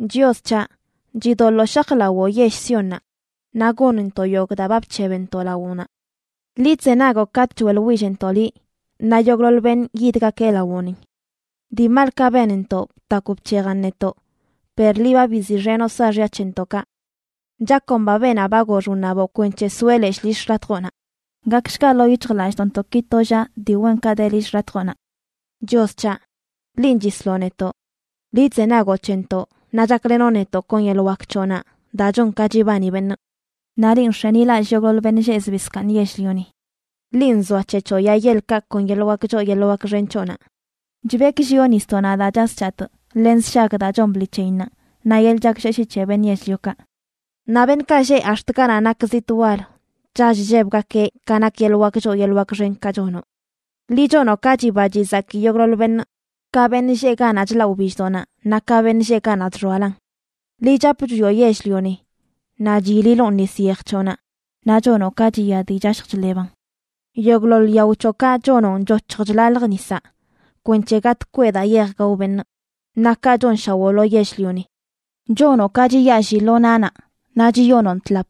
Chios c̱haꞌ, chidoḻoo shajlawoo yell Siónnaꞌ, naꞌ gonntoꞌ yogꞌ daa ba bc̱hebntoꞌ lawoꞌnaꞌ. Liꞌ chzenagoꞌ katꞌ choeꞌḻwillntoꞌ liꞌ, naꞌ yogꞌḻoḻ beṉꞌ yidgakeꞌ lawoꞌni. Dii malkaꞌ benntoꞌ btakw bc̱hejan netoꞌ, per liꞌ ba biziꞌxenoꞌ saaxya c̱hentoꞌkaꞌ. Chakomba beenaꞌ ba gox wṉaboꞌ kwenc̱he soeꞌ leshꞌ lill xḻatjoꞌnaꞌ. Gakshga ḻoo yic̱hjlallꞌdoꞌntoꞌki to llaꞌ dii wenkaꞌ de lill xḻatjoꞌnaꞌ. Chios c̱haꞌ, linꞌ chisloꞌ netoꞌ. Liꞌ chzenagoꞌ c̱hentoꞌ naꞌ chaklenoꞌ netoꞌ kon yeḻꞌ wak c̱hoꞌnaꞌ daa chon ka chibani beṉꞌ. Naꞌ linꞌ nx̱enilallꞌ yogꞌḻoḻ beṉꞌ lleꞌ zbii zkaaṉ yell-lioni. Linꞌ nzoac̱hec̱hoꞌ yaa yeḻkaꞌ kon yeḻꞌ wak choo yeḻꞌ wak xen c̱hoꞌnaꞌ. Chbekllioꞌ nisdoꞌnaꞌ daa chas chatꞌ len sshag daa chon bḻi c̱heyinnaꞌ, naꞌ yeḻꞌ chaklleshii c̱he beṉꞌ yell-liokaꞌ. Naꞌ beṉꞌkaꞌ lleꞌ ax̱t ganaꞌ nak zitꞌ wal chall chllebgakeꞌ ka nak yeḻꞌ wak choo yeḻꞌ wak xenkaꞌ chonoꞌ. Liꞌ chonoꞌ ka chiba chizaki yogꞌḻoḻ beṉꞌ, ka beṉꞌ lleꞌ ganaꞌ chlaꞌ wbilldoꞌnaꞌ naꞌ ka beṉꞌ lleꞌ ganaꞌ chxoalan. Liꞌ chap chwioꞌ yell-lioni naꞌ chyililoꞌn nis yej c̱hoꞌnaꞌ; naꞌ chonoꞌ ka chiya dii chashj chḻeban. Yogꞌḻoḻ yao c̱hoꞌkaꞌ chonoꞌn choc̱hj chlalj nisaꞌ, kwenc̱he gatꞌ kweꞌ daa yeej gao beṉꞌ. Naꞌ kaꞌ chonshawoꞌ lo yell-lioni. Chonoꞌ ka chiyaalli lo nanaꞌ, naꞌ chiyonoꞌn tlap.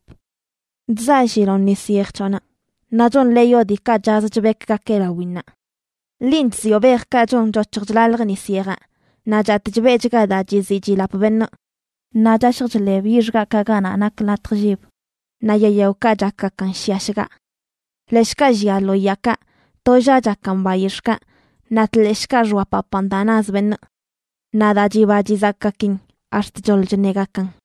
Chzaalliloꞌn nis yej c̱hoꞌnaꞌ, naꞌ chonḻeeyoꞌ diikaꞌ chaz chbekgakeꞌ lawinnaꞌ. Linꞌ chzioꞌ bejkaꞌ chon choc̱hj chlalj nis yejaꞌ, naꞌ chatꞌ chbeꞌchga daa chiziꞌ chilap beṉꞌ, naꞌ chashj chḻeb yix gaꞌkaꞌ ganaꞌ nak latj llib, naꞌ yaa yaokaꞌ chakgakan shiꞌa shgaꞌ. Leshꞌkaꞌ llia lo yaakaꞌ, tollaꞌ chakan bayix̱ꞌkaꞌ, naꞌ tleshꞌkaꞌ xoapapan daa naz beṉꞌ. Naꞌ daa chiba chizakgakin ax̱t choḻ chṉegakan.